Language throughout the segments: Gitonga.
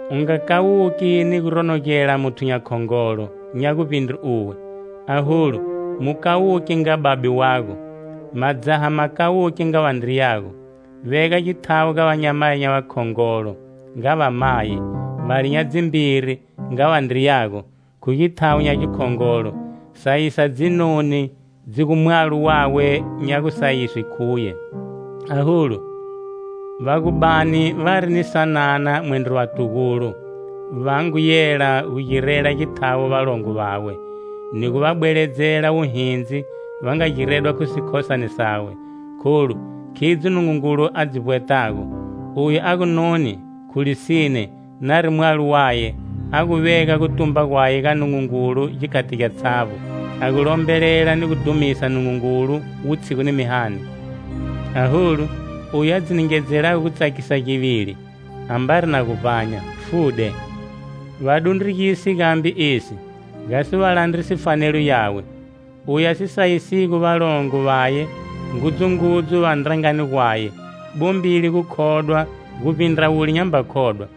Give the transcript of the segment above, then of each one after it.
U nga kawuki ni gu ronogela muthu nya khongolo nya guvbindre uwe, aholu, mu kawuke nga babe wago. Madzaha ma kawuke nga vandriyago. Vega githawo ga vanyamayi nya vakhongolo, nga vamayi, vale nya dzimbiri, nga vandriyago, khu githawo nya gikhongolo. Sayisa dzinoni dzi gu mwalo wawe nya gusayiswe khuye. Aholu, va gu bani vari ni sanana mwendro vatugulo, va ngu yela gu girela githawo valongo vawe, ni gu va bweledzela wuhindzi va nga giredwa khu sikhosane sawe. Kholu, khidzo Nungungulu a dzi vbwetago. Oyu a gu noni, khu lisine, nari mwalo waye, a gu vega gutumba gwaye ga Nungungulu gikhati gyatshavbo, a gu lombelela ni gu dhumisa Nungungulu wutshigu ni mihani. Aholu, oyu a dzi ningedzelago gutsakisa givili, ambari na gu vbanya, fude. Va dundrugise gambe esi, gasi va landrise fanelo yawe. Oyu a si sayisigo valongo vaye, ngudzungudzu va ndrangani gwaye, bombile gukhodwa guvbindra wule nyamba khodwa.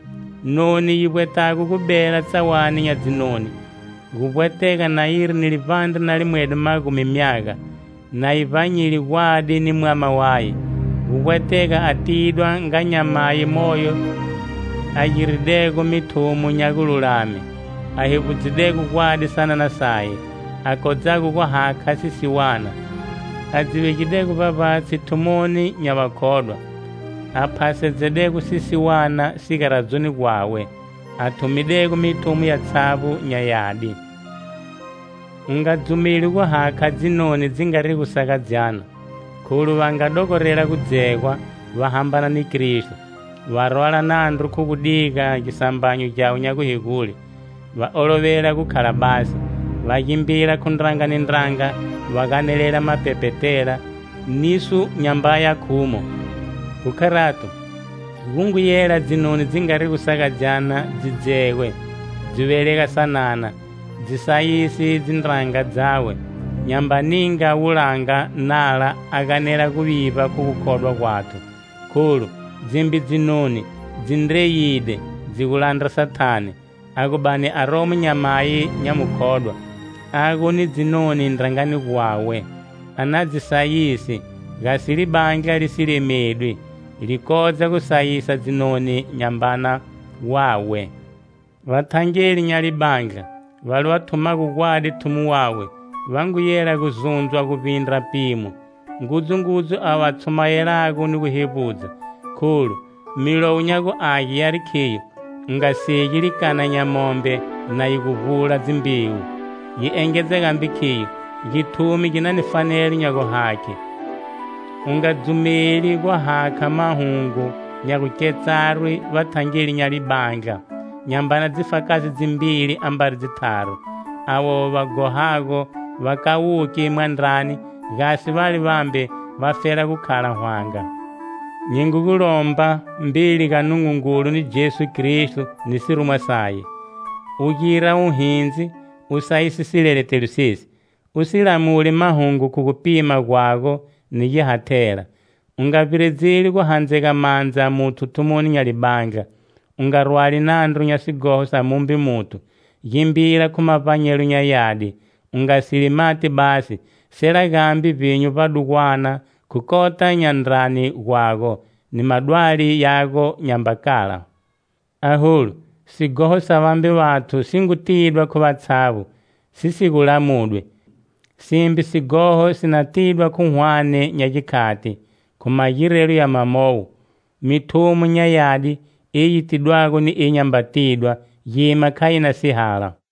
Noni yi vbwetago gu bela tsawani nya dzinoni, gu vbwetega na yiri ni livbandre na limwedo magumi myaga, na yi vbanyide gwadi ni mwama waye. Gu vbwetega a tidwa nga nyamayi moyo a giridego mithumo nya gululame, a hevbudzidego gwadi sanana saye, a kodzago gu hakha sisiwana, a dzi vegidego vbavbatshi thumoni nya vakhodwa, a phasedzedego sisiwana sigaradzoni gwawe, a thumidego mithumo yatshavbo nya yadi. U nga dzumeli gu hakha dzinoni dzi ngarigo sagadzyana kholu va nga dogorela gudzegwa, va hambana ni Kristo, va rwala nandru khu gu diga gisambanyo gyawe nya guhegule. Va olovela gu khala basi, va gimbila khu ndranga ni ndranga, va ganelela mapepetela niso nyambaya khumo. Khu kharato, gu ngu yela dzinoni dzi ngarigo sagadzyana dzi dzegwe, dzi velega sanana, dzi sayise dzindraga dzawe, nyamba ninga wulanga nala a ganela guvivba khu gukhodwa gwathu. Kholu dzimbe dzinoni dzi ndreyide dzi gu landra Sathane. A gu bani aromo nyamayi nya mukhodwa, a gu ni dzinoni ndrangani gwawe, a na dzi sayise, gasi libandla li si lemedwi, li kodza gu sayisa dzinoni nya mbana wawe. Vathangeli nya libandla, vale va thumago gwadi thumo wawe, va ngu yela gu zundzwa guvbindra pimo, ngudzungudzu ava va tshumayelago ni guhevbudza. Kholu, Milowo nya gu Age yari khiyo: "U nga segi likana nya mombe na yi gu vbula dzimbewu." Yi engedza gambe khiyo: "Githumi gi na ni fanelo nya guhakhe." U nga dzumeli guhakha mahungu nya gu ketsarwi vathangeli nya libandla nyambana dzifakazi dzimbili ambari dzitharu. Avo va ghohago va kawuke mwandrani, gasi vale vambe vafela gu khala hwanga. Nyi ngu gu lomba, mbeli ga Nungungulu ni Jesu Kristo ni sirumwa saye, u gira wuhindzi u sayise sileletelo sesi, u si lamuli mahungu khu gupima gwago, ni gihathela. U nga vbiredzeli gu handzega mandza muthu thumoni nya libandla, u nga rwali nandru nya sighoho sa mumbe muthu, gimbila khu mavbanyelo nya yadi. U nga seli mati basi, sela gambe vbinyu vbadugwana khu kota nya ndrani gwago, ni madwali yago nyamba kala. Aholu, sighoho sa vambe vathu si ngu tidwa khu vatshavbo, si gu lamudwi, simbe sighoho si na tidwa khu hwane nya gikhati. Khu magirelo ya mawowo, mithumo nya yadi, eyi yi tidwago ni eyi nyamba tidwa gima kha yi na sihala.